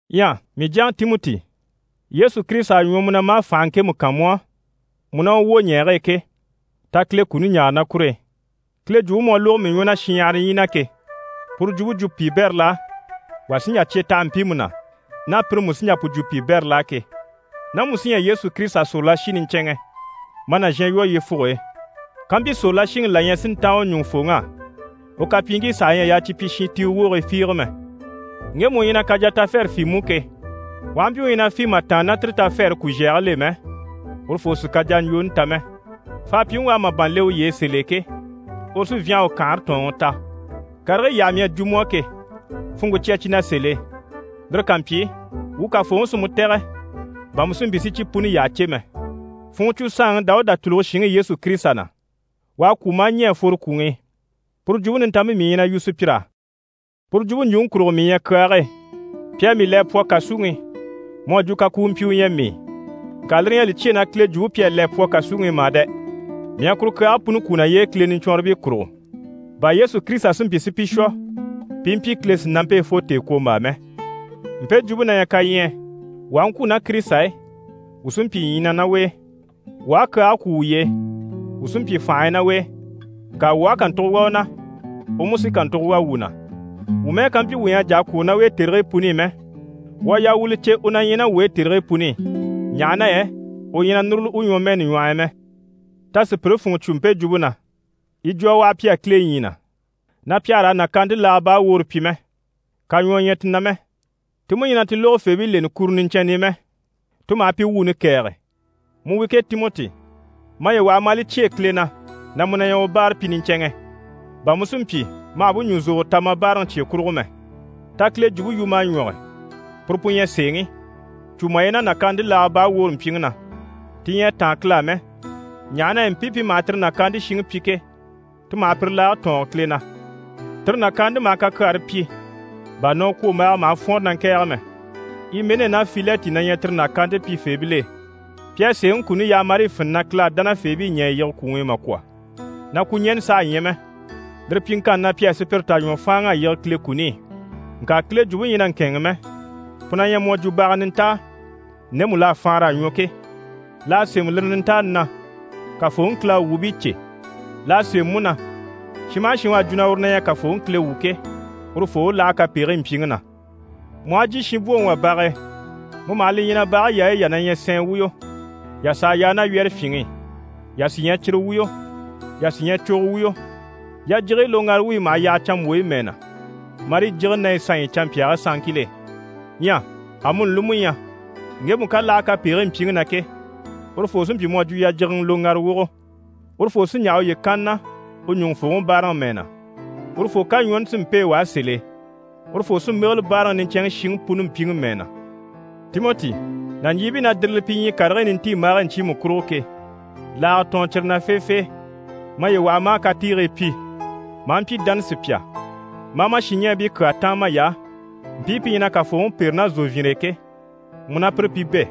Ɲyɛ mii jyaŋi Timɔti, Yesu Kirisita à ɲwɔ mu na maa fànhe ŋkemu kan mu á, mu ná u wwoɲɛɛge e ke, ta Kile kuni ɲaare ná kur'e. Kile Jwumpe mu à lógo mii ɲwɔ na shinɲyahara ɲyii na ke, puru jwumpe jwo piibɛril'á, wà sí n‑jà cye taha mpiimu na, ná pire mú sí n‑jà pu jwo piibɛril'á ke. Ná mu sí ɲyɛ Yesu Kirisita sòrolashi niɲcɛnŋɛ, ma nàzhan lwɔ́ yyefuge e. Kampyi sòrolashiŋi la ɲyɛ si ntáan u ɲùŋufooŋ'á, u kapyiiŋkii saha ɲyɛ a yaa cyi pyi shintiiwe wogii fiige mɛ. Ŋgemu u ɲyɛ na kajatafɛrɛ fî mú ke, u aha mpyi u ɲyɛ na fî mà tàanna ná tire tafɛɛre kuzhɛgil'e mɛ, urufoo sì kajaɲjwooni ta mɛ. Faapyiŋi u à màban le uye e sèl'e ke, uru sí n‑fyânha u kanhare tɔ̀ɔnŋi ta. Karigii yyaha mii à jwo mu á ke, funŋke cya cyi na sèl'e. Lire ká mpyi, wuu Kafooŋi sí mu tɛ̀gɛ bà mu si mpyi si cyi puni yyaha cè mɛ. Funŋɔ cwo saanŋi Dawuda tùluge shinŋi Yesu Kirisita na, u à kwû maa ɲɛ̀ a fworo kwùŋi i. Puru Jwumpe Nintanmpe mii ɲyɛ na yu sùpyir'á. Puru jwumpe ɲjwuŋi kurugo, mii ɲyɛ kyaage e, pi à mii le a pwɔ kàsuŋi i, mu à jwo kakuumpyi u ɲyɛ mii. Ŋka lire ɲyɛ a li cyêe na Kile Jwumpe pi à le a pwɔ kàsuŋi i mà dɛ! Mii à kuru kyaage puni kwú naye e, Kile niɲcwɔnribii kurugo, bà Yesu Kirisita si mpyi si pi shwɔ pi i mpyi Kile sìnampe e fo tèekwombaa mɛ. Mpe jwumpe na ɲyɛ kaɲyɛɛ: Wuu aha ŋkwû ná Kirisita e, wuu sí n‑pyi ɲyii na ná u e. Wuu aha kyaage kwú wuye e, wuu sí n‑pyi fànhe e ná u e, ŋka wuu aha kàntugo wà u na, u mú sí kàntugo wà wuu na. Wuu mɛ́ɛ ká mpyi wuu ɲyɛ a jà a kwôro ná u e tèrigii puni i mɛ, wuu a yaa wuu li cè u na ɲyɛ ná wuu e tèrigii puni i ɲaha na yɛ u ɲyɛ na núruli u ɲwɔmɛɛni ɲwɔh'i mɛ. Ta sùpyire funŋɔ cwo mpe jwumpe na, yi jwo a waha pi á Kile ɲyii na, na pi àha raa nàkaante laaga baa woore pyi mɛ, kaɲwɔɔ ɲyɛ ti na mɛ, ti mú ɲyɛ na ti lógofeebii leni kuro niɲcɛnni i mɛ, ti maha pi wuuni kɛ̀ɛge. Mu wi ke Timɔti, maye waha ma a li cyêe Kile na na mu na ɲyɛ u báarapyi niɲcɛnŋɛ, bà mu si mpyi ma hà bú ɲùzogoro ta ma báaraŋi cye kurugo mɛ. Ta Kile jwumpe yu ma a ɲwɔge, puru pu ɲyɛ sèeŋi. Cû maye na nàkaante laaga baa woore mpyiŋi na, ti ɲyɛ a táan Kile á mɛ, ɲaha na yɛ mpii pi maha tire nàkaante shiŋi pyi ke, ti maha pire laage tɔɔnge Kile na. Tire nàkaante maha kakyaare pyi, bà nɔkwombaaga maha fwɔ́nre na ŋkɛ̀ɛge mɛ. Imɛnɛ ná Filɛti na ɲyɛ tire nàkaante pyifeebil'e. Pi à sèeŋi kuni yaha marii fini na Kile à dánafeebii ɲɛ̀ a yige kwùŋi i mà kwɔ̀, na kwuɲɛnɛ saha ɲyɛ mɛ. Lire pyiŋkanni na, pi à sùpyire tà ɲwɔ fáanŋa a yige Kile kuni i. Ŋka Kile Jwumpe ɲyɛ na ŋkɛ̂ɛnŋi mɛ, pu na ɲyɛ mu à jwo baga nintaa ndemu l'à faanra a ɲwɔ ke, l'à sémɛ lire nintaani na: «Kafooŋi Kile à u wuubii cè.» L'à sémɛ mú na: «Shin maha shin u à jwo na uru na ɲyɛ Kafooŋi Kile wu ke, urufoo u láha kapegigii mpyiŋi na.» Mu aha jyè shinbwoŋi wà bage e, mu maha li ɲya na bage yaayi yà na ɲyɛ sɛɛn wuyo, yà s'à yaa ná wyɛ́rɛfyinŋi i, yà sí ɲyɛ cire wuyo, yà sí ɲyɛ cogo wuyo. Yajigiyi loŋgara wuyi maha yaha canmbwoyi mɛɛ na, marii jígini ná yi sanɲyi i canmpyaagii sanŋkil'e. Ɲyɛ amuni li mú ɲyɛ, ŋgemu ká láha kapegigii mpyiŋi na ke, urufoo sí n‑pyi mu à jwo yajigiŋɛ loŋgara wogo. Urufoo sí n‑yaha uye kanni na u ɲùŋufooŋi báaraŋi mɛɛ na. Urufoo kaɲwɔɔni sí n‑pêe u á sèl'e. Urufoo sí n‑bégele báaraŋi niɲcɛnŋi shiŋi puni mpyiŋi mɛɛ na. Timɔti, nàɲjiibii na dìrili pi ɲyii karigii nintiimbaagii ɲcyiimu kurugo ke, laaga tɔɔn cyire na feefee! Maye waha ma a katiigii pyi, ma a mpyi dánasupya, ma a ma shinɲɛɛbii kyaa táan may'á, mpii pi ɲyɛ na Kafooŋi pêre ná zòvyinre e ke, mu ná pire pi bɛ̂.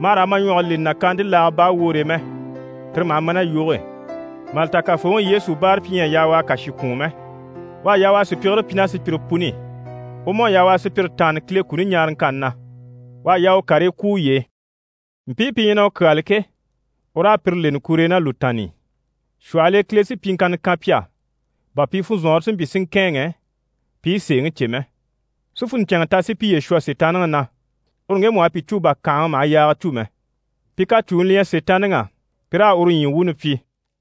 Ma hà raa ma ɲwɔge leni nàkaante laaga baa woore e mɛ, tire maha ma ná yoge e. Mà li ta Kafooŋi Yesu báarapyi ɲyɛ a yaa u a kàshi kwùun mɛ. U à yaa u a sùpyigire pyi ná sùpyire puni i, u mú à yaa u a sùpyire taanni Kile kuni ɲaaraŋkanni na, u à yaa u karii kwú uye e. Mpii pi ɲyɛ na u kyáali ke, u raa pire leni kur'e ná lùtaanni i. Shwɔhɔl'e Kile sí pyiŋkanna kan pi á, bà pi funzɔnŋɔre si mpyi si ŋkɛ̂ɛnŋɛ, pi i sèeŋi cè mɛ, si funɲcɛnŋɛ ta si piye shwɔ Sitaanniŋi na, uru ŋgemu u à pi cû bà kànhaŋa maha yaaga cû mɛ. Pi kacuni li ɲyɛ Sitaanniŋi á, pi raa uru ɲyii wuuni pyi.